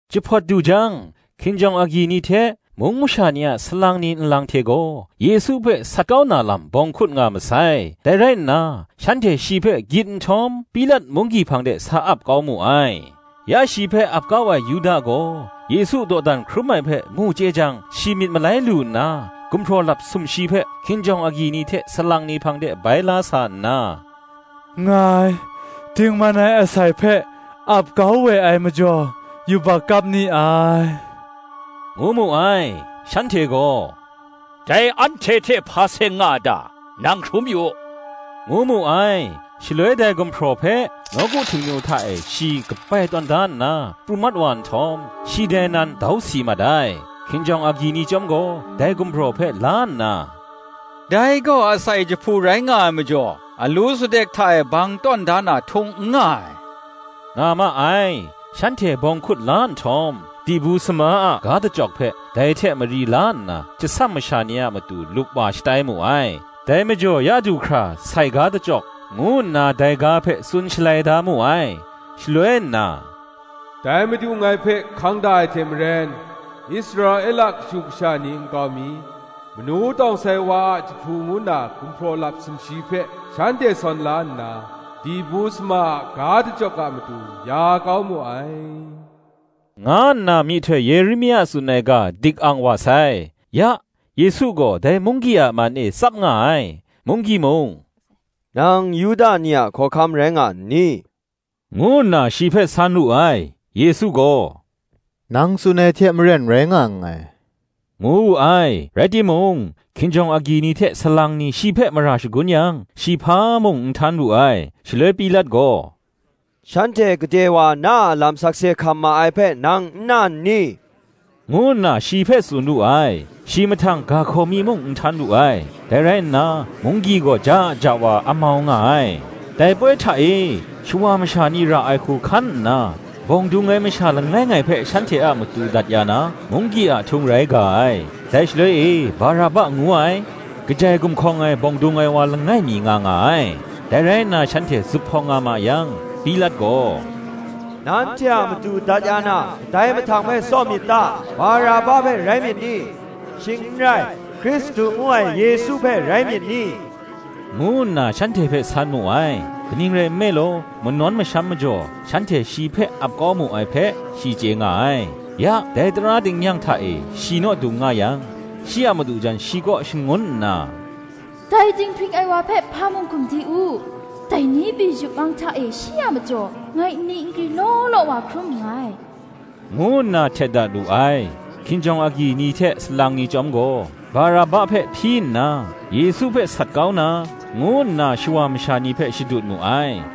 Jahpawt du jang, hkinjawng agyi ni hte, mung masha ni a salang ni nlang hte gaw, Yesu hpe sat kau na lam bawng hkut nga masai: dai rai nna, shanhte shi hpe gyit nhtawm, Pilat munggyi hpang de sa ap kau mu ai. Ya shi hpe ap kau ai Yuda gaw, Yesu dawdan hkrum ai hpe mu chye jang shi myit malai lu nna, gumhpraw lap sumshi hpe hkinjawng agyi ni hte salang ni hpang de bai la sa nna, “Ngai dingman ai asai hpe ap kau we ai majaw, yubak kap ni ai,” ngu mu ai. Shanhte gaw, “Dai anhte hte hpa seng nga a ta? nang hkrum yu u” ngu mu ai. Shaloi dai gumhpraw hpe, nawku Htingnu hta e shi kabai tawn da nna, pru mat wa nhtawm, shi dai nan dau si mat ai. Hkinjawng agyi ni chyawm gaw, dai gumhpraw hpe la nna, “Dai gaw asai jahpu rai nga ai majaw, alu sutdek hta e bang tawn da na htung n nga ai,” nga ma ai. Shanhte bawng hkut la nhtawm, dibu sama a ga dachyawk hpe, dai hte mari la nna, tsasam masha ni a matu lupwa shatai mu ai. Dai majaw ya du hkra ‘Sai ga dachyawk,’ ngu nna dai ga hpe tsun shalai da mu ai. Shaloi nna, “Dai Madu ngai hpe hkang da ai hte maren, Israela kashu kasha ni nkau mi, manu tawng sai wa ai jahpu ngu na gumhpraw lap sumshi hpe shanhte sawn la nna, dibu sama a ga dachyawk a matu ya kau mu ai, nga nna myihtoi Yeremia tsun ai ga dik ang wa sai. Ya, Yesu gaw dai munggyi a man e tsap nga ai: munggyi mung, Nang Yuda ni a hkawhkam rai nga n ni? ngu nna shi hpe san wu ai: Yesu gaw, Nang tsun ai hte maren rai nga nngai, ngu wu ai. Rai timung, hkinjawng agyi ni hte salang ni shi hpe mara shagun yang, shi hpa mung n htan wu ai. Shaloi Pilat gaw, Shanhte gade wa na a lam sakse hkam ma ai hpe nang n na n ni? ngu nna shi hpe tsun wu ni. Shi mahtang ga hkaw mi muk n htan wu ai: dai rai nna, munggyi gaw ja ja wa amau nga ai. Dai poi hta e, shawa masha ni ra ai hku hkan nna, bawng dung ai masha langai ngai hpe shanhte a matu dat ya na, munggyi a ahtung rai ga ai. Dai shaloi e Baraba ngu ai, kajai gumhkawng ai bawng dung ai wa langai mi nga nga ai. Dai rai nna shanhte zuphpawng nga ma yang, Pilat gaw, Nanhte a matu dat ya na, kadai mahtang hpe tsaw myit ta? Baraba hpe rai myit ni? shing n rai, Hkristu ngu ai Yesu hpe rai myit ni? ngu nna shanhte hpe san mu ai: Kaning rai nme law, manawn masham majaw, shanhte shi hpe ap kau mu ai hpe, shi chye nga ai. Ya, dai tara tingnyang hta e shi naw dung nga yang, shi a madu jan shi kaw shangun nna, Dai dinghpring ai wa hpe hpa mung hkum di u; dai ni pyi, yup mang hta e shi a majaw, ngai nni nkri law law wa hkrum nngai, ngu nna htet dat wu ai. Hkinjawng agyi ni hte salang ni chyawm gaw, Baraba hpe hpyi nna, Yesu hpe sat kau na, ngu nna shawa masha ni hpe shadut mu ai.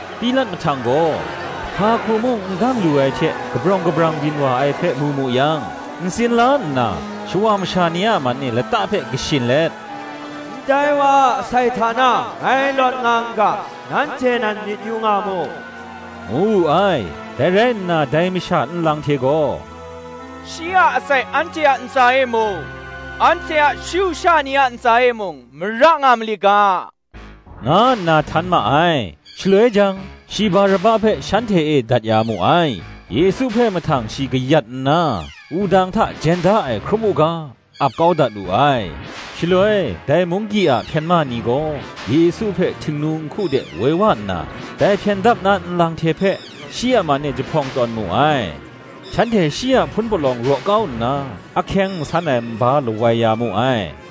Pilat mahtang gaw, hpa hku mung n dang lu ai hte kabrawng kabrang byin wa ai hpe mu mu yang, ntsin la nna, shawa masha ni a man e lata hpe kashin let, Ndai wa a asai hta na ngai lawt nga n ga: nanhte nan myit yu nga mu, ngu wu ai. Dai rai nna dai masha nlang hte gaw, Shi a asai anhte a ntsa e mung, anhte a shu sha ni a ntsa e mung mara nga mali ga, nga nna htan ma ai. Shaloi jang, shi Baraba hpe shanhte e dat ya mu ai: Yesu hpe mahtang shi kayat nna, wudang hta jen da ai hkrum u ga, ap kau dat wu ai. Shaloi, dai munggyi a hpyen ma ni gaw, Yesu hpe htingnu nhku de woi wa nna, dai hpyen dap na nlang hte hpe, shi a man e jahpawng tawn mu ai. Shanhte shi a hpun palawng raw kau nna, ahkyeng nsan ai nba lawai ya mu ai: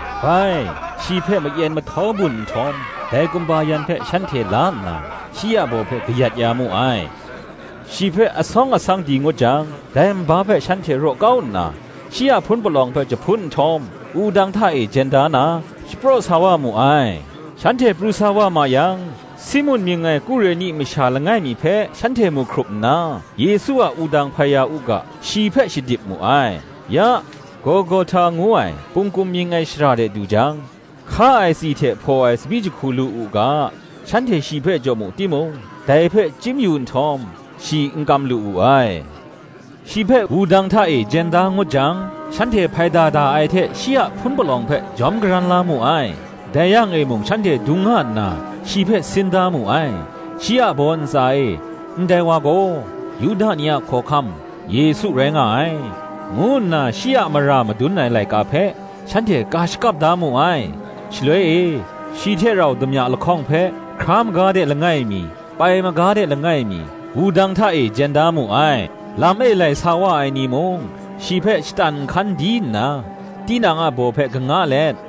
bai, shi hpe mayen mahtaw bun nhtawm, dai kumba yan hpe shanhte la nna, shi a baw hpe kayat ya mu ai. Shi hpe asawng asang di ngut jang, dai nba hpe shanhte raw kau nna, shi a hpun palawng hpe jahpun nhtawm, wudang hta e jen da na, shapraw sa wa mu ai. Shanhte pru sa wa ma yang, Simun mying ai Kureni masha langai mi hpe shanhte mu hkrup nna, Yesu a wudang hpai ya u ga, shi hpe shadip mu ai. Ya, Golgohta ngu ai, Pungkum mying ai shara de du jang, hka ai tsi hte hpaw ai tsabyi jahku lu u ga, shanhte shi hpe jaw mu timung, dai hpe chyim yu nhtawm, shi n kam lu wu ai. Shi hpe wudang hta e jen da ngut jang, shanhte hpaida da ai hte shi a hpun palawng hpe jawm karan la mu ai: dai yang e mung shanhte dung nga nna shi hpe sin da mu ai. Shi a baw ntsa e Ndai wa gaw, Yuda ni a khawhkam, Yesu rai nga ai, ngu nna shi a mara madun ai laika hpe shanhte ka shakap da mu ai. Shaloi e, shi hte rau damya lahkawng hpe, hkra maga de langai mi, pai maga de langai mi, wudang hta e jen da mu ai. Lam e lai sa wa ai ni mung, shi hpe shatan nhkan di nna, tinang a baw hpe kanga let,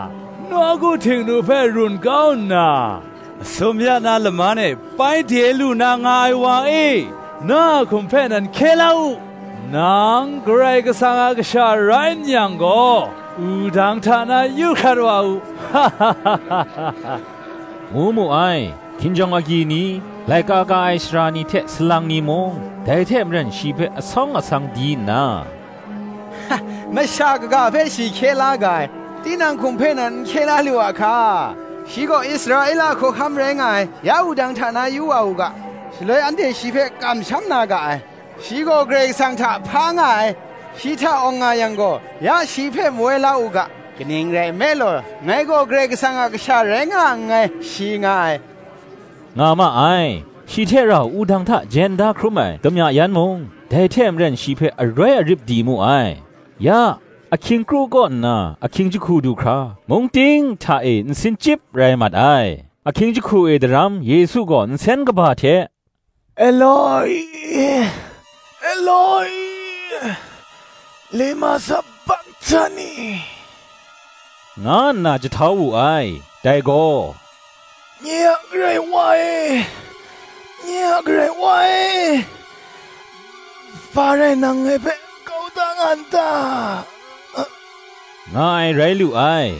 nawku Htingnu hpe run kau nna, masum ya na laman e bai de lu na nga ai wa e, na a hkum hpe nan hkye la u: nang Karai Kasang a Kasha rai n yang gaw, wudang hta na yu hkrat wa u, ngu mu ai. Hkinjawng agyi ni, laika ka ai sara ni hte salang ni mung, dai hte maren shi hpe asawng asang di nna, Masha kaga hpe shi hkye la ga ai: tinang hkum hpe nan n hkye la lu a hka. Shi gaw Israela hkawhkam rai nga ai; ya wudang hta na yu wa u ga, shaloi anhte shi hpe kamsham na ga ai. Shi gaw Karai Kasang hta hpa nga ai; shi hta awng nga yang gaw, ya shi hpe mawai la u ga: kaning rai nme law, Ngai gaw Karai Kasang a Kasha rai nga nngai, shi nga ai, nga ma ai. Shi hte rau wudang hta jen da hkrum ai damya yan mung dai hte maren shi hpe aroi arip di mu ai. Ya, ahkying kru kaw nna, ahkying jahku du hkra, mung ting hta e nsin chyip rai mat ai. Ahkying jahku e daram Yesu gaw nsen kaba hte, Elo-i, Elo-i lema sabakhtani? nga nna jahtau wu ai: dai gaw, Nye a Karai Wa e, nye a Karai Wa e, hpa rai nang ngai hpe kau da nga n ta? nga ai, rai lu ai.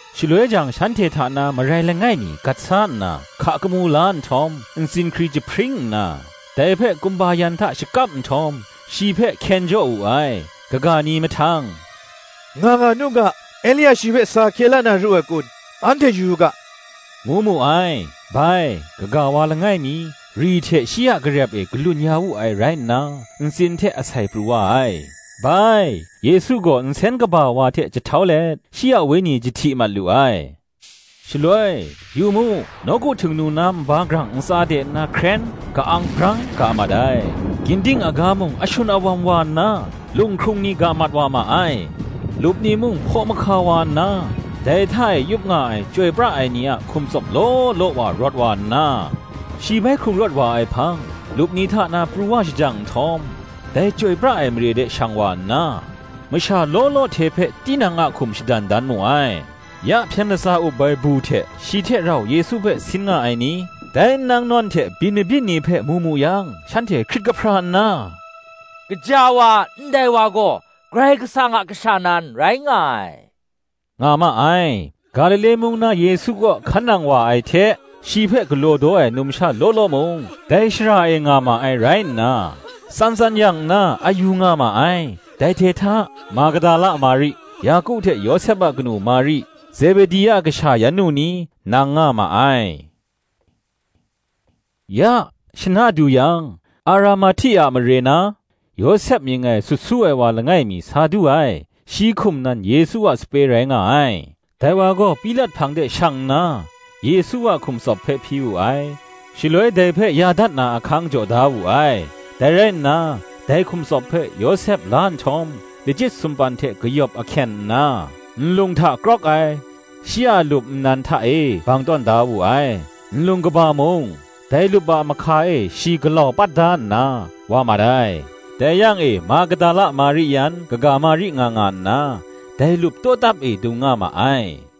Shaloi jang shanhte hta na marai langai mi gat sa nna, hka kamu la nhtawm, ntsin hkri jahpring nna, dai hpe kumba yan hta shakap nhtawm, shi hpe hkyen jaw wu ai. Kaga ni mahtang, Nga nga nu ga; Elia shi hpe sa hkye la na ru ai kun, anhte yu yu ga, ngu mu ai. (Bai, kaga wa langai mi, ri hte shi a garep e galun ya wu ai rai nna, ntsin hte asai pru wa ai.) Bai Yesu gaw nsen kaba wa hte jahtau let, shi a wenyi jahti mat lu ai. Shaloi, yu mu, nawku Htingnu na nba grang ntsa de nna hkren, ka-ang brang ga mat ai; ginding aga mung ashun awam wa nna, lunghkrung ni ga mat wa ma ai; lup ni mung hpaw mahka wa nna, dai hta e yup nga ai chyoi pra ai ni a hkum tsawp law law wa rawt wa nna, shi bai hkrung rawt wa ai hpang lup ni hta na pru wa shajang nhtawm, dai chyoi pra ai mare de shang wa nna, masha law law hte hpe tinang nang a hkum shadan dan mu ai. Ya hpyen latsa up ai bu hte shi hte rau Yesu hpe sin nga ai ni, dai nnang nawn hte byin mabyin ni hpe mu mu yang shanhte hkrit kahpra nna, Gaja wa, ndai wa gaw Karai Kasang a Kasha nan rai nga ai, nga ma ai. Galile mung na Yesu kaw hkan nang wa ai hte shi hpe galaw daw ai numsha law law mung, dai shara e nga ma ai rai nna, tsan tsan yang nna a yu nga ma ai: dai hte hta Magdala Mari, Yaku hte Yawsep a kanu Mari, Zebedi a kasha yan nu ni, nang nga ma ai. Ya, shana du yang, Aramahti a mare na, Yawsep mying ai sut su ai wa langai mi sa du ai; shi hkum nan Yesu a sape rai nga ai. Dai wa gaw Pilat hpang de shang nna, Yesu a hkum tsawp hpe hpyi wu ai, Shaloi dai hpe ya dat na ahkang jaw da wu ai. Dai rai nna, dai hkum tsawp hpe Yawsep la nhtawm, lachyit sumpan hte kayawp ahkyen nna, nlung hta krawk ai, shi a lup nnan hta e bang tawn da wu ai: nlung kaba mung, dai lup a mahka e shi galau pat da nna, wa mat ai. Dai yang e Magdala Mari yan kaga Mari nga nga nna, dai lup tawtap e dung nga ma ai.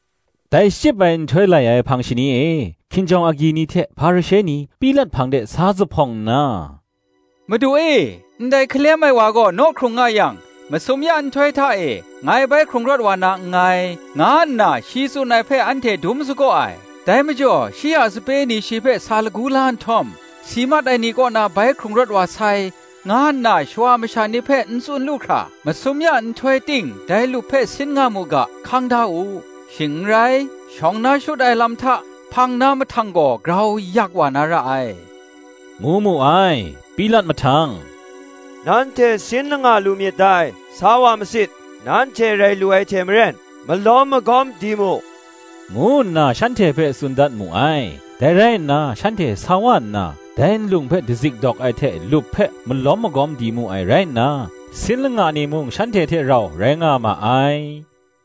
Dai shachyip ai nhtoi lai ai hpang shani e, hkinjawng agyi ni hte Hparishe ni Pilat hpang de sa zuphpawng nna, Madu e, ndai hkalem ai wa gaw naw hkrung nga yang, Masum ya nhtoi hta e, ngai bai hkrung rawt wa na nngai, nga nna shi tsun ai hpe anhte dum sagaw ai. Dai majaw shi a sape ni shi hpe sa lagu la nhtawm, Si mat ai ni kaw na bai hkrung rawt wa sai, nga nna shawa masha ni hpe n tsun lu hkra, masum ya nhtoi ting dai lup hpe sin nga mu ga, hkang da u: shing n rai, shawng na shut ai lam hta, hpang na mahtang gaw grau yak wa na ra ai, ngu mu ai. Pilat mahtang, Nanhte sin langa lu myit dai; sa wa masit: nanhte rai lu ai hte maren, malawm magawm di mu, ngu nna shanhte hpe tsun dat mu ai. Dai rai nna shanhte sa wa nna dai nlung hpe dazik dawk ai hte lup hpe malawm magawm di mu ai rai nna, sin langa ni mung shanhte hte rau rai nga ma ai.